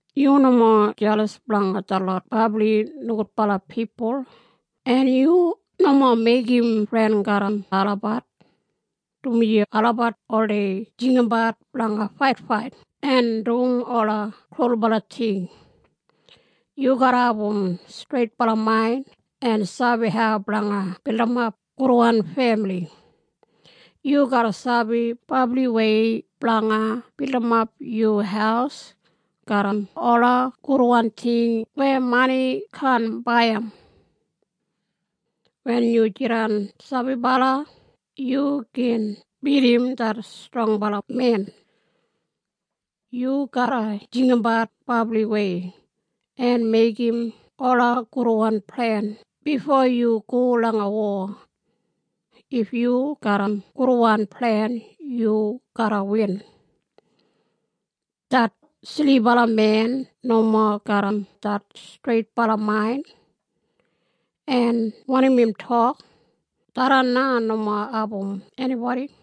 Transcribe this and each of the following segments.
Yu nomo jelas blanga detlot brabli nogudbala pipul, en yu nomo meigim fren garram olabat, dumaji olabat oldei jinggabat blanga faitfait en dum ola krulbala ting. Yu garra abum streitbala main en sabi hau blanga bildimap gudwan femili. Yu garra sabi brabliwei blanga bilimap yu haus garram ola gudwan ting weya mani kaan baiyim. Wen yu jidan sabibala yu gin bidim det strongbala men. Yu garra jinggabat brabliwei en meigim ola gudwan plen bifo yu go langa wo. If yu garram gudwan plen yu garra win. Det silibala men nomo garram det streitbala main, en wanim im tok, tharran na nomo album enibodi.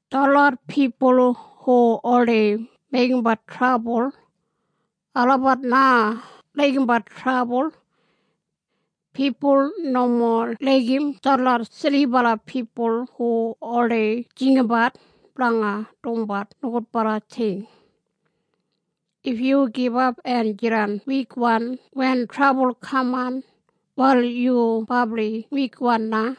Detlot pipul hu oldei meigimbat trabul, olabat na laigimbat trabul. Pipul nomo laigim detlot silibala pipul hu oldei jinggabat blanga dumbat nogudbala ting. If yu gibap en jidan wikwan wen trabul kaman, wal yu brabli wikwan na.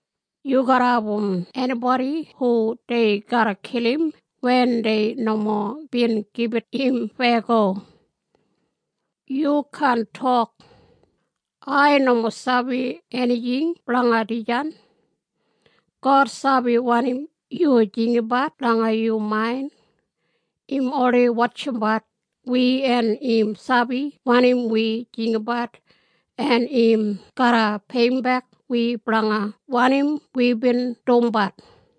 Yu garra album enibodi hu dei garra kilim wen dei nomo bin gibit im feyago. Yu kaan tok, “Ai nomo sabi enijing blanga dijan.” God sabi wanim yu jinggabat langa yu main. Im oldei wotjimbat wi en im sabi wanim wi jinggabat en im garra peiyimbek wi blanga wanim wibin dumbat.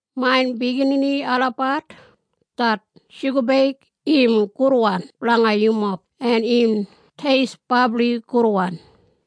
Main biginini olabat, det shugabeig im gudwan blanga yumob en im teist brabli gudwan.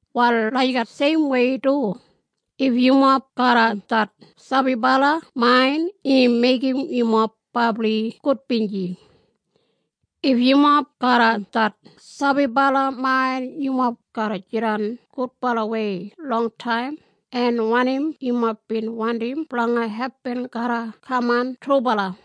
Wal lagijat seimwei du, if yumob garram det sabibala main im meigim yumob brabli gudbinji. If yumob garram det sabibala main yumob garra jidan gudbalawei longtaim en wanim yumob bin wandim blanga hepin garra kaman trubala.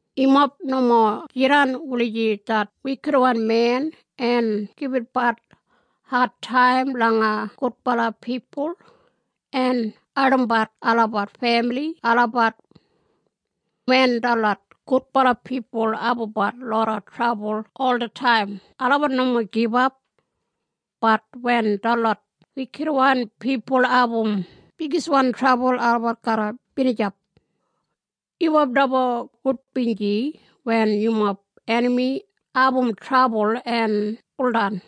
Yumob nomo jidan wulijim det wikitwan men en gibitbat adtaim langa gudbala pipul en ardimbat olabat femili olabat. Wen detlot gudbala pipul abumbat loda trabul olataim olabat nomo gibap, bat wen detlot wikitwan pipul abum bigiswan trabul olabat garra binijap. Yumob nomo gudbinji wen yumob enami abum trabul en buldan.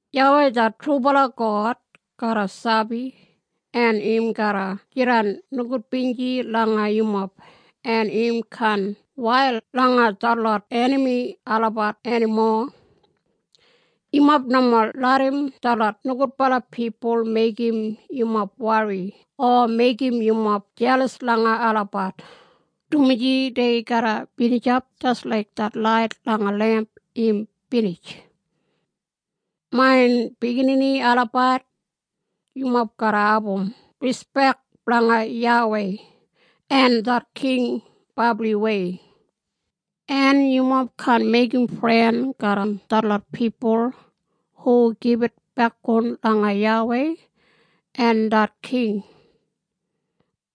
YAWEI det trubala God garra sabi en im garra jidan nogudbinji langa yumob en im kaan wail langa detlot enami olabat enimo. Yumob nomo larram detlot nogudbala pipul meigim yumob wori o meigim yumob jelas langa olabat, dumaji dei garra binijap jis laik det lait langa lemp im binij. Main biginini olabat, yumob garra abum rispek blanga YAWEI en det king brabliwei, en yumob kaan meigim fren garram detlot pipul hu gibit bekboun langa YAWEI en det king.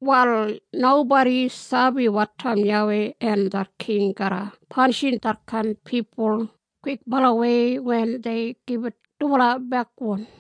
Wal nobodi sabi wotaim YAWEI en det king garra panishim detkain pipul kwikbalawei wen dei gibit dubala bekboun.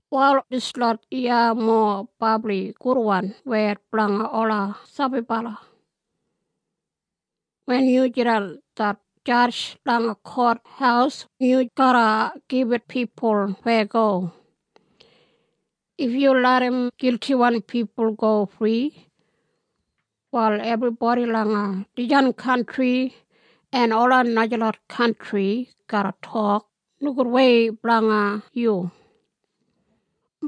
Wal dislot iya mowa brabli gudwan wed blanga ola sabibala. Wen yu jidan det jadj langa kothaus yu garra gibit pipul feyago. If yu larram giltiwan pipul go fri, wal ebribodi langa dijan kantri en ola najalot kantri garra tok nogudwei blanga yu.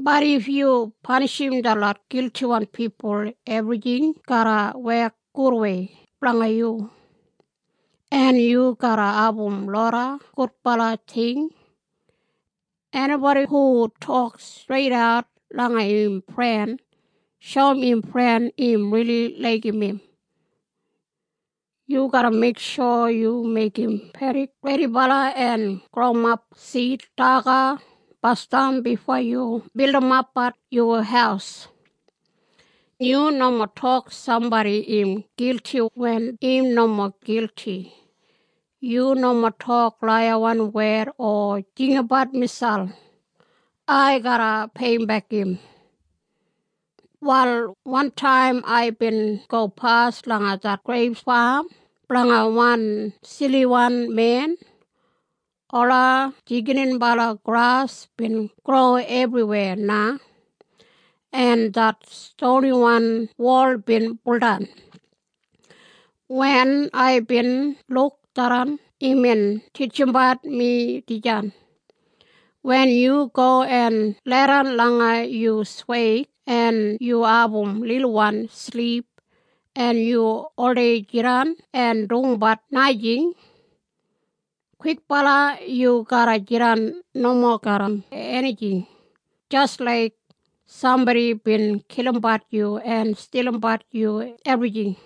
Bat if yu panishim detlot giltiwan pipul ebrijing garra wek gudwei blanga yu, en yu garra abum loda gudbala ting. Enibodi hu tok streidat langa im fren, shoum im fren im rili laigim im. Yu garra meiksho yu meigim pedik redibala en growimap sid daga basdam bifo yu bildimapbat yu haus. Yu nomo tok sambodi im gilti wen im nomo gilti. Yu nomo tok laiyawan wed o jinggabat miselp, “Ai garra peiyimbek im.” Wal wantaim aibin gopas langa det greip fam blanga wan siliwan men. Ola jigininbala gras bin gro ebriweya na, en det stoniwan wol bin buldan. Wen aibin luk tharran imbin titjimbat mi dijan. Wen yu go en leidan langa yu sweig en yu abum lilwan silip en yu oldei jidan en dumbat najing, kwikbala yu garra jidan nomo garram enijing jis laik sambodi bin kilimbat yu en stilimbat yu ebrijing.